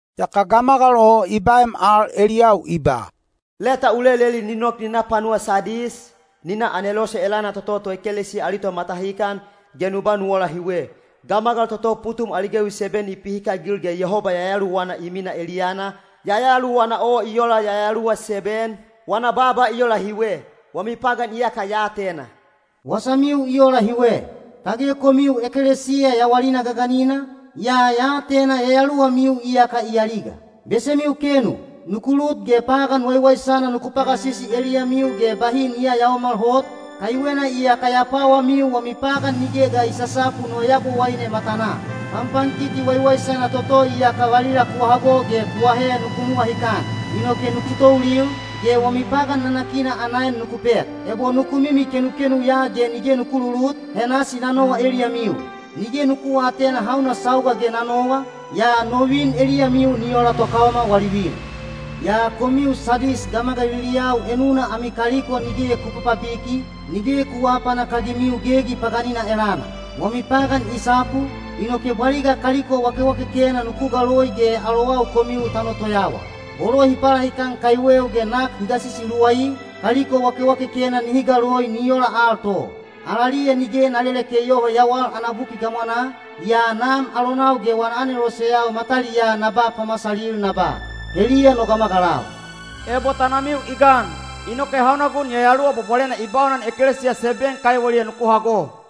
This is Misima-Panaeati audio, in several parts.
Yaka gamagal o i baem al eliyau i ba, “Leta u leleli ni nok ni na panuwa Sadis, ni na anelose elana toto toekelesiya ali tomatahikan, ge nu ba nu ola hiwe: Gamagal toto putum ali gewi seben i pihikagil ge Yehoba Yayaluwana i minaa eliyana, Yayaluwana o i ola yayaluwa seben, wana baaba i ola hiwe. Wami pagan iyaka ya atena. Wasamiu i ola hiwe, tage komiu ekelesiya yawalina gaganina, yaa ya atena yayaluwamiu iyaka i aliga. Besemiu kenu! Nuku lut ge pagan waiwaisana nuku pagasisi eliyamiu ge bahi ni yayaomal hot, kaiwena iyaka ya pwawamiu wami pagan nige ga i sasapu no Yabowaine matanaa. Panpankiti waiwaisana toto iyaka valila ku hago ge ku ahe nuku nuwahikan. Inoke nuku toulil, ge wami pagan nanakina ana en nuku pek. Ebo nuku mimi kenukenu ya ge nige nuku lulut, he nasi na nowa eliyamiu. Nige nuku aatena hauna sauga ge na nowa, yaa no vin eliyamiu ni ola tokaoma wali vin. Yaa komiu Sadis gamagaliliyau enuna ami kaliko nige ku papabiki, nige ku aapanak-agimiu gegi paganina elana. Wami pagan i sapu, inoke bwaliga kaliko wakewakekena nuku galoi ge alowau komiu ta notoyawa. Bolo hi palahikan kaiweu ge nak hi gasisi luwai, kaliko wakewakekena nihi galoi ni ola al to. Alaliya nige na leleke yoho yawal ana buki gamwanaa, yaa Nam alonau ge wana aneloseyau mataliyaa na ba pamasalil na ba, ‘Heliya no gamagalau.’ Ebo tanamiu i gan, inoke hauna gun Yayaluwa Bwabwalena i baunan ekelesiya seben kaiweliya nuku hago.”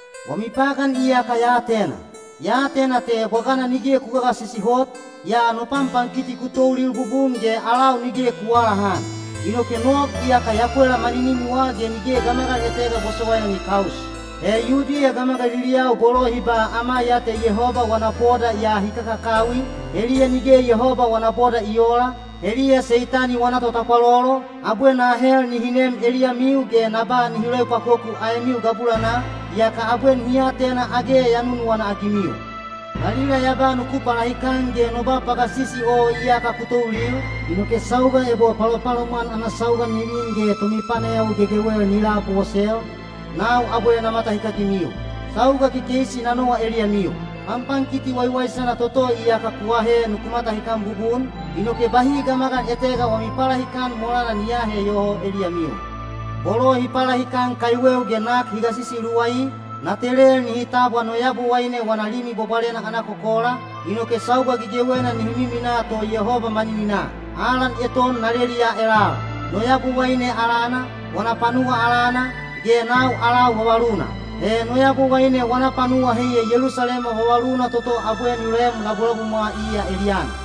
Wami pagan iyaka ya atena. Ya atena te bwagana nige ku gagasisi hot, yaa no panpankiti ku toulil bubun ge alau nige ku aalahan. Inoke nog iyaka ya pwela maninimiwa ge nige gamagal etega bosowaina ni kaus. He Yudiya gamagaliliyau bolo hi ba ‘Ama ya te Yehoba wana boda’ yaa hi kakakawi, heliya nige Yehoba wana boda i oola, heliya Seitani wana totapwalolo, abwe na ahel nihi nem eliyamiu ge na ba nihi loepwakoku aemiu gabulanaa, yaka abwe nihi atena age ya nunuwana-agimiu. Valila ya ba nuku palahikan ge no ba pagasisi o iyaka ku toulil, inoke sauga ebo palopalomwan ana sauga ni vin ge tomipanayawi gegewel ni labosel, nau abwe na matahikagimiu. Sauga kekeisi na nowa eliyamiu. Panpankiti waiwaisana toto iyaka ku ahe nuku matahikan bubun, inoke bahi gamagal etega wami palahikan molana ni aahe yoho eliyamiu. Bolo hi palahikan kaiweu ge nak hi gasisi luwai, na telel nihi tabwa no Yabowaine wana Limi Bwabwalena ana kokola, inoke sauga gegewena nihi miminaa to Yehoba manininaa. Alan eton na leliya elal: no Yabowaine alana, wana panuwa alana, ge nau alau vavaluna. He no Yabowaine wana panuwa heiya Yelusalema vavaluna toto abwe ni loem labulabumwa iya eliyana.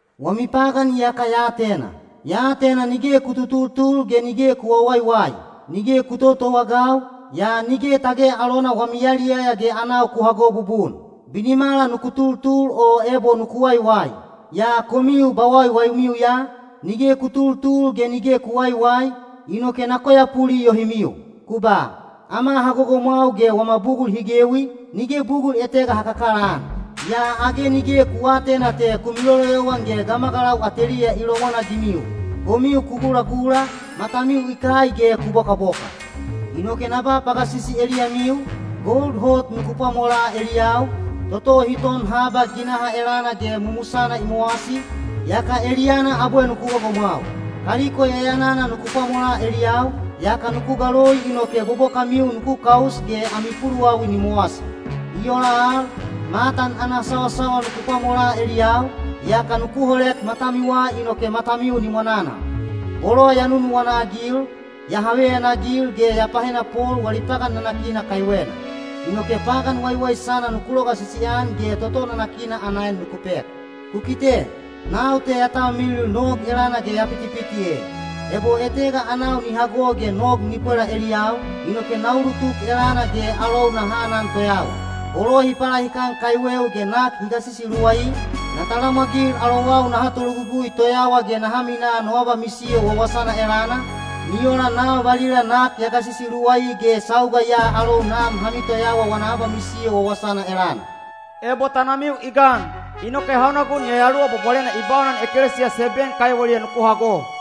Wami pagan iyaka ya atena. Ya atena nige ku tutultul ge nige ku wawaiwai. Nige ku totowaagau, yaa nige tage alona wami yaliyaya ge anau ku hago bubun. Binimala nuku tultul o ebo nuku waiwai. Yaa komiu bwawaiwaimiu ya, nige ku tultul ge nige ku waiwai, inoke na koyapuli yohimiu. Ku ba, ‘Ama ha gogomwau ge wama bugul hi gewi, nige bugul etega ha kakalaan.’ Yaa age nige ku aatena te ku miloloyowan ge gamagalau ateliya i lomwanagimiu. Komiu ku gulagula, matamiu i kai ge ku bokaboka. Inoke na ba pagasisi eliyamiu, gold enowana hot nuku pwamolaa eliyau, toto hi ton haba ginaha elana ge mumusana i mowasi, yaka eliyana abwe nuku gogomwau. Kaliko yayanana nuku pwamolaa eliyau, yaka nuku galoi inoke bobokamiu nuku kaus ge ami puluwawi ni mowasi. I ola al, matan ana sawasawal nuku pwamolaa eliyau, yaka nuku holek matamiwa inoke matamiu ni mwananal. Bolo ya nunuwana-agil, ya haveyanagil ge ya pahenapol wali pagan nanakina kaiwena. Inoke pagan waiwaisana nuku logasisi-an ge toto nanakina ana en nuku pek. Ku kite! Nau te ya talmilil nog elana ge ya pitipiti e. Ebo etega anau ni hago ge nog ni pwela eliyau, inoke na ulutuk elana ge alou naha anan toyawa. Bolo hi palahikan kaiweu ge nak hi gasisi luwai, na talamwagil alowau naha tologugui toyawa ge naha minaa no abamisiyo wawasana elana, ni ola nau valila nak ya gasisi luwai ge sauga ya alou Nam ha mitoyawa wana abamisiyo wawasana elana. Ebo tanamiu i gan, inoke hauna gun Yayaluwa Bwabwalena i baunan ekelesiya seben kaiweliya nuku hago.”